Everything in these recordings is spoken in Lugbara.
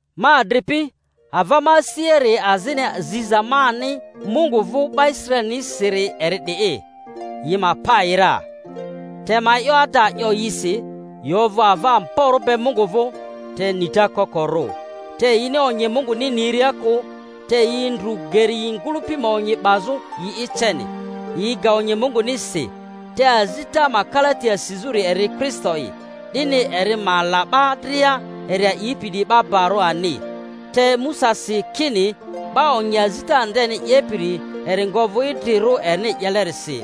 Ma adripi, ava ma asiari azini ziza mani Mungu vᴜ 'ba Israelinisiri eri 'di'i, yi ma pa yi ra. Te ma e'yo ada 'yo yisi, yi ovᴜ ava amborᴜ be Mungu vᴜ, te nita koko-rᴜ. Te yini onyi Munguni niria kᴜ, te yi ndru geri yi ngᴜlᴜpi ma onyi 'bazᴜ yi'i ceni, yi ga onyi Munguni si. Te azita ma kalati asizᴜri eri Kristo'i, 'dini eri ma la 'ba dria eri a'ipi 'diyi barᴜ ani. Te Musa si kini 'ba onyi azita ndeni 'yepiri eri nga ovᴜ idrirᴜ erini 'yelerisi.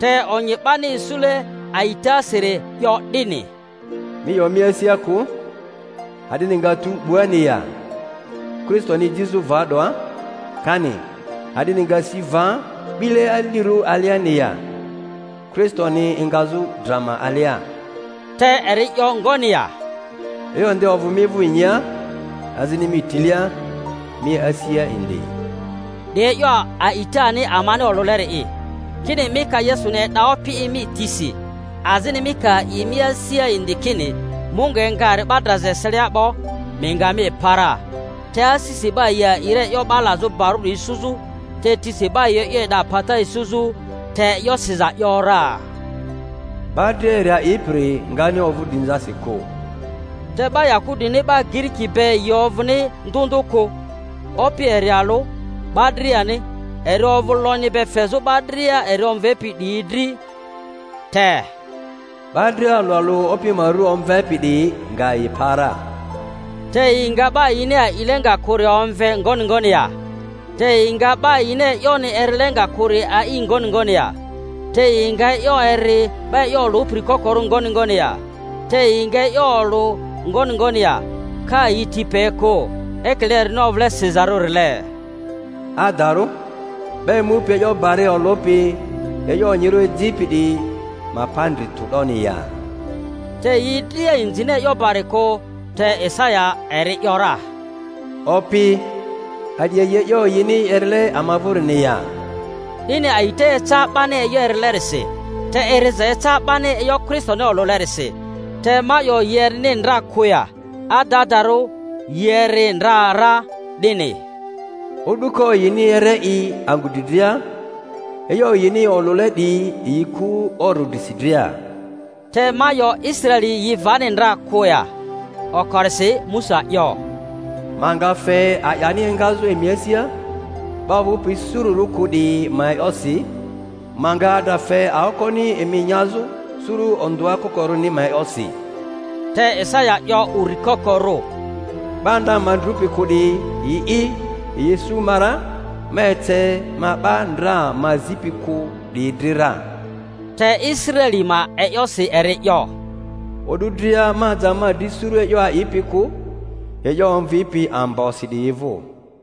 Te onyi 'bani isule a'itasiri 'yo 'dini, Mi 'yo mi asia kᴜ, A'dini nga tu 'buani ya? (Kristoni ejizᴜ va 'doa) kani, A'dini nga si va 'bile alirᴜ aliani ya? (Kristoni engazᴜ dra ma alia). Te eri 'yo ngoni ya? E'yo nde ovᴜ mi vᴜ inyia, azini mi tilia, mi asia indi ('di e'yo a'itani amani olᴜleri'i); kini mi ka Yesuni e'da Opi'i mi tisi, azini mi ka a'i mi asia indi kini Mungu enga eri 'ba draza eselia 'bo, mi nga mi pa ra. Te asisi 'ba yi a'i ra e'yo 'ba lazᴜ barᴜri isuzᴜ, te tisi 'ba yi e'yo e'da pata isuzᴜ. Te e'yo siza ‘yora, 'Ba dria eri a'ipiri ngani ovᴜ drinzasi kᴜ. Te 'ba Yahudini 'ba Giriki be yi ovᴜni ndᴜ ndᴜ kᴜ; Opi eri alᴜ 'ba driani, eri ovᴜ lonyi be fezᴜ 'ba dria eri omvepi 'diyi dri. Te, 'Ba dria alᴜ alᴜ Opi ma ru omvepi 'diyi nga yi pa ra. Te yi nga 'ba yini a'ile nga kᴜri omve ngoni ngoni ya? Te yi nga 'ba yini e'yoni erile nga kᴜri a'i ngoni ngoni ya? Te yi nga e'yo eri, 'ba e'yo olᴜpiri kokorᴜ ngoni ngoni ya? Te yi nga e'yo olᴜ ngoni ngoni ya, ka yi ti pe kᴜ? Ekile erini ovᴜle sizarᴜrile, Adarᴜ 'ba emupi e'yo bari olᴜpi e'yo onyirᴜ ejipi 'diyi ma pa ndri tᴜ 'doni ya! Te yi dria inzini e'yo bari kᴜ; te Isaya eri ‘yora, Opi, a'di a'i e'yo yini erile ama vᴜrini ya? 'Dini a'ita eca 'bani e'yo erilerisi, te eriza eca 'bani e'yo Kristoni olᴜlerisi. Te ma 'yo, yi erini ndra kᴜ ya? Adadarᴜ yi eri ndra ra; 'dini O'duko yini ere yi angᴜ dri dria, e'yo yini olᴜle 'diyi yi ku oro drisi dria. Te ma 'yo, Israeli yi vani ndra kᴜ ya? Okorisi Musa 'yo, Ma nga fe a'yani engazᴜ emi asia 'ba ovᴜpi sururᴜ kᴜ 'diyi ma e'yosi; ma nga adra fe aokoni emi nyazᴜ suru ondᴜa kokorᴜri ma e'yosi. Te Isaya 'yo uri kokorᴜ, 'Ba ndra ma ndrupi kᴜ 'diyi, yi'i yi isu ma ra; ma ece ma 'ba ndra ma zipi kᴜ 'diyi dri ra. Te Israeli ma e'yosi eri 'yo, O'du dria ma aja ma dri suru e'yo a'ipi kᴜ, e'yo omvipi ambosi 'diyi vᴜ.